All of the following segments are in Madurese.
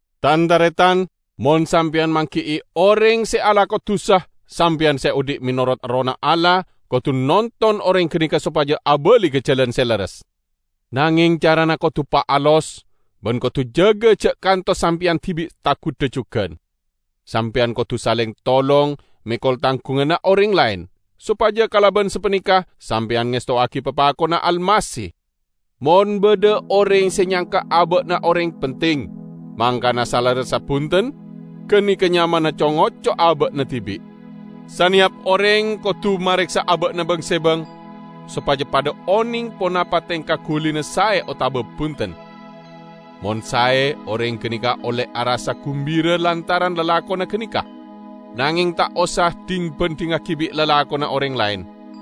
Tan-taretan! Mon sampeyan manggi'i oreng se alako dusa, sampeyan se odhi' menorot Errohna Allah, kodu nonton oreng ganeka sopaja abali ka jalan se lerres. Nangeng carana kodu paalos, ban kodu jaga ja' kantos sampeyan dibi' tagudha jugan. Sampeyan kodu saleng tolong mekol tanggunganna oreng laen, sopaja kalaban sapaneka sampeyan ngestowagi papakonna Almasih. Mon badha oreng se nyangka aba'na oreng penting, mangkana salerressa bunten, ganeka nyamana co-ngoco aba'na dibi'. Saneyap oreng kodu mareksa aba'na bang-sebang sopaja padha oneng ponapa tengka gulina sae otaba bunten. Mon sae, oreng ganeka olle arassa gumbira lantaran lalakonna ganeka. Nangeng ta' osa dhing-bandhingngagi bi' lalakonna oreng laen.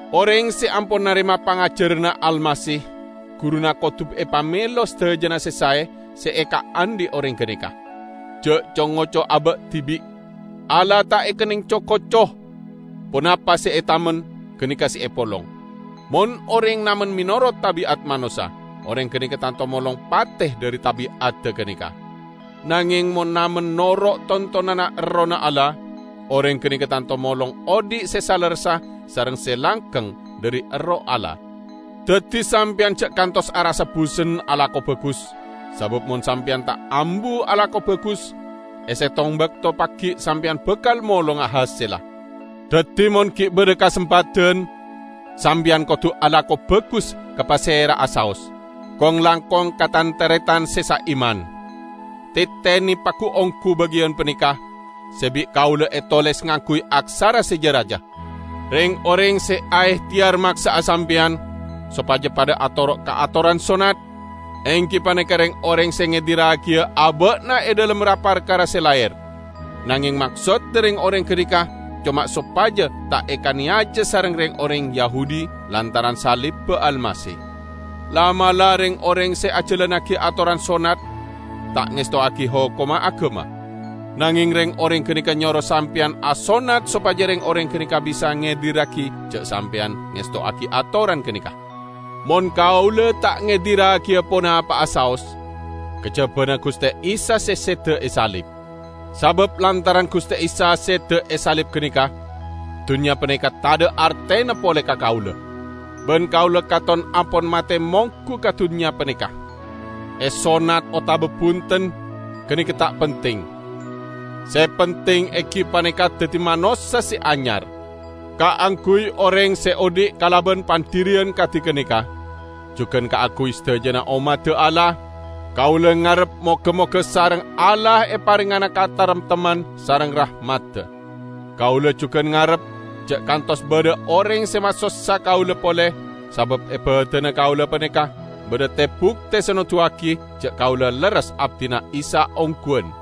Oreng se ampon narema pangajaranna Almasih, guruna kodu epamelo sadajana se sae se ekaandhi' oreng ganeka. Ja' co-ngoco aba' dibi'. Allah ta' ekenneng co-koco. Ponapa se etamen, ganeka se epolong. Mon oreng namen menorot tabi'at manossa, oreng ganeka tanto molong pate dhari tabi'adda ganeka. Nangeng mon namen noro' tontonanna Errohna Allah, oreng ganeka tanto molong odhi' se salerressa sareng se langgeng dhari Erroh Allah. Daddi sampeyan ja' kantos arassa busen alako bagus; sabab mon sampeyan ta' ambu alako bagus, e settong bakto pagi' sampeyan bakal molonga hasella. Daddi, mon gi' badha kasempadan, sampeyan kodu alako bagus ka pasera'a saos, kong-langkong ka tan-taretan se saiman. Tetene pagu-onggu bagiyan paneka, se bi' kaula etoles ngangguy aksara se ja-raja. Reng-oreng se aehteyar maksa'a sampeyan sopaja padha atoro' ka atoran sonnat, enggi paneka reng-oreng se ngedirragiya aba'na e dhalem ra-parkara se laher. Nangeng maksodda reng-oreng ganeka coma sopaja ta' ekaneyaja sareng reng-oreng Yahudi lantaran salibba Almasih. La'-mala' reng-oreng se ajalannagi atoran sonnat ta' ngestowagi hokomma agama. Nangeng reng-oreng ganeka nyoro sampeyan asonnat sopaja reng-oreng ganeka bisa ngedirragi ja' sampeyan ngestowagi atoran ganeka. Mon kaula ta' ngedirragiya ponapa'a saos, kajabana Guste Isa se seda e salib. Sabab lantaran Guste Isa seda e salib ganeka, dunnya paneka tadha' artena pole ka kaula. Ban kaula katon ampon mate monggu ka dunnya paneka. Esonnat otaba bunten, ganeka ta' penting. Se penting enggi paneka daddi manossa se anyar. Kaangguy oreng se odhi' kalaban pandhiriyan kadi ganeka, jugan kaangguy sadajana ommadda Allah, kaula ngarep moga-moga sareng Allah eparengngana kataremtemman sareng rahmadda. Kaula jugan ngarep, ja' kantos badha oreng se masossa kaula pole, sabab e badanna kaula paneka badha te-bukte se noduwagi ja' kaula lerres abdina Isa ongguwan.